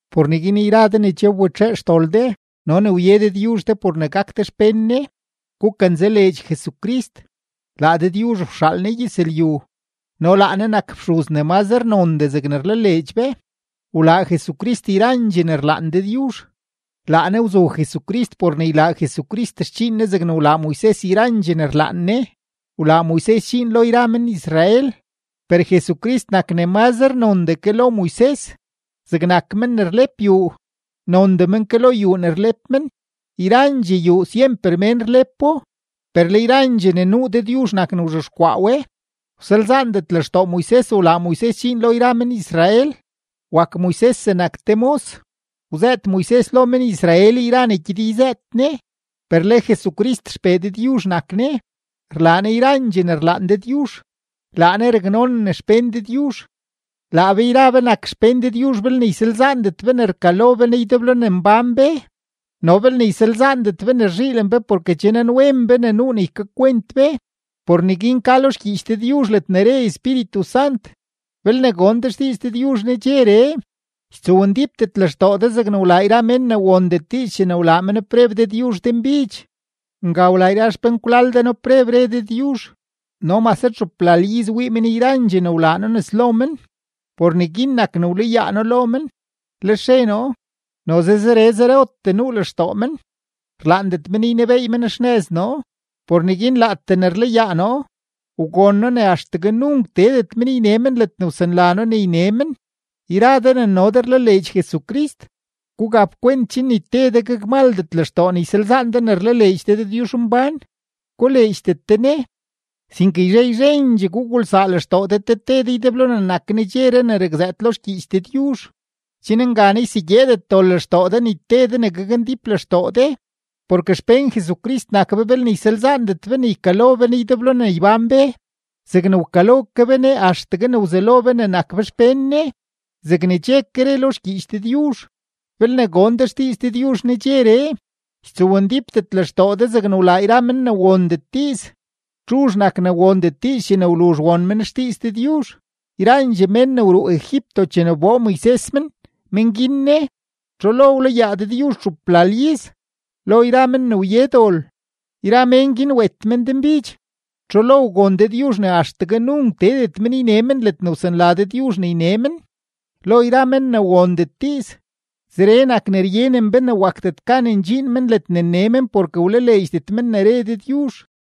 Por neguin yra de ne che wbetxee xdol de no ne wye Dëdyuzh de por ne gak de xpén Ne, gukanzaleedx Jesucrist, laa Dëdyuzh wxaal Ne gyëzlyu no laa Ne nak fxuz ne mazre nondee zegne rlaleedx be. Wlaa Jesucrist yrandxee ne rlaan Dëdyuzh, laa Ne wzu Jesucrist por ne ylaa Jesucrist xdxiin Ne zegne wlaa Moises yrandxee ne rlaan Ne, wlaa Moises dxiin lo yra men-Israel. Per Jesucrist nak ne mazre nondee ke lo Moises, zegnak men ne rlep yuu, nondee men ke lo yuu ne rlep men. Yrandxee yuu syemper mén rlepo, per le yrandxee ne nuu, Dëdyuzh nak ne wzhexkwaa we. Wsalzaandet lextoo Moises wlaa Moises dxiin lo yra men-Israel, wak Moises zegnak te mos, wzëët Moises lo men-Israel yra ne gyed yzëët Ne. Per le Jesucrist XPee Dëdyuzh nak Ne, rlaa Ne yrandxee ne rlaan Dëdyuzh, laa Ne raknonen xpén Dëdyuzh. Laa be yra be nak xpén Dëdyuzh belne ysalzaandet be ne rkalo be Ne ydeblo ne mbán be no belne ysalzaandet be ne rzhiilen be porke che nanwen be ne nuu ne ykakwent be. Por neguin ka lo xgyiich Dëdyuzh ledne re Espíritu Sant: Belne gon de xdiiz Dëdyuzh nedxeree, ytsowndípdet lextoo de zegne wlaa yra men ne wondet diiz chene wlaa men preb Dëdyuzh denbidx. Nga wlaa yra xpenkwlal de noo preb, no mase txuplal iz wii men yrandxee ne wlaa noo nes lo men, re Dëdyuzh. Por neguin nak ne wlayaa noo lo men, lex re noo: “Noze zere zerotee nuu lextoo men, rlaandet men ynebeey men xnëz noo.” Por neguin laatee ne rlayaa noo, wgon noo ne axtegue nunk teedet men yne men ledne wsanla noo ne yne men. Yra de ne no de rlaleedx Jesucrist, gugap kwent chen ni te de gakmaldet lextoo ne ysalzaan de ne rlaleedx de Dëdyuzhmbán, koleedxdet de Ne. Sinke yzhe yzhendxee gugulsaa lextoo de te te de ydeblo ne nak “nedxeree” ne rakzëët lo xgyiich Dëdyuzh, chen nganaa ysegyeedet dol lextoo de ni te de ne gakndíp lextoo de. Porke xpén Jesucrist nak be belne ysalzaandet be ne ykalo be Ne ydeblo ne ybán be zegne wkalo ke be Ne axtegue ne wzelo be ne nak be xpén Ne. Zegne che ke re lo xgyiich Dëdyuzh: Belne gon de xdiiz Dëdyuzh nedxeree, ytsowndípdet lextoo de zegne wlaa yra men ne wondet diiz. ¿Txuzh nak ne wondet diiz chene wluzh won men xdiiz Dëdyuzh? Yrandxee mén ne wruu Egipto chene wboo Moises men, men guin ne. ¿Txu lo wlayaa Dëdyuzh txuplal iz? Lo yra men ne wye dol, yra mén guin wet men denbidx. ¿Txu lo wgon Dëdyuzh ne axtegue nunk teedet men yne men ledne wsanla Dëdyuzh ne yne men? Lo yra men ne wondet diiz. Zeree nak ne ryenen be ne wakdet gan ndxiin men ledne nne men porke wlaleedxdet men ne re Dëdyuzh.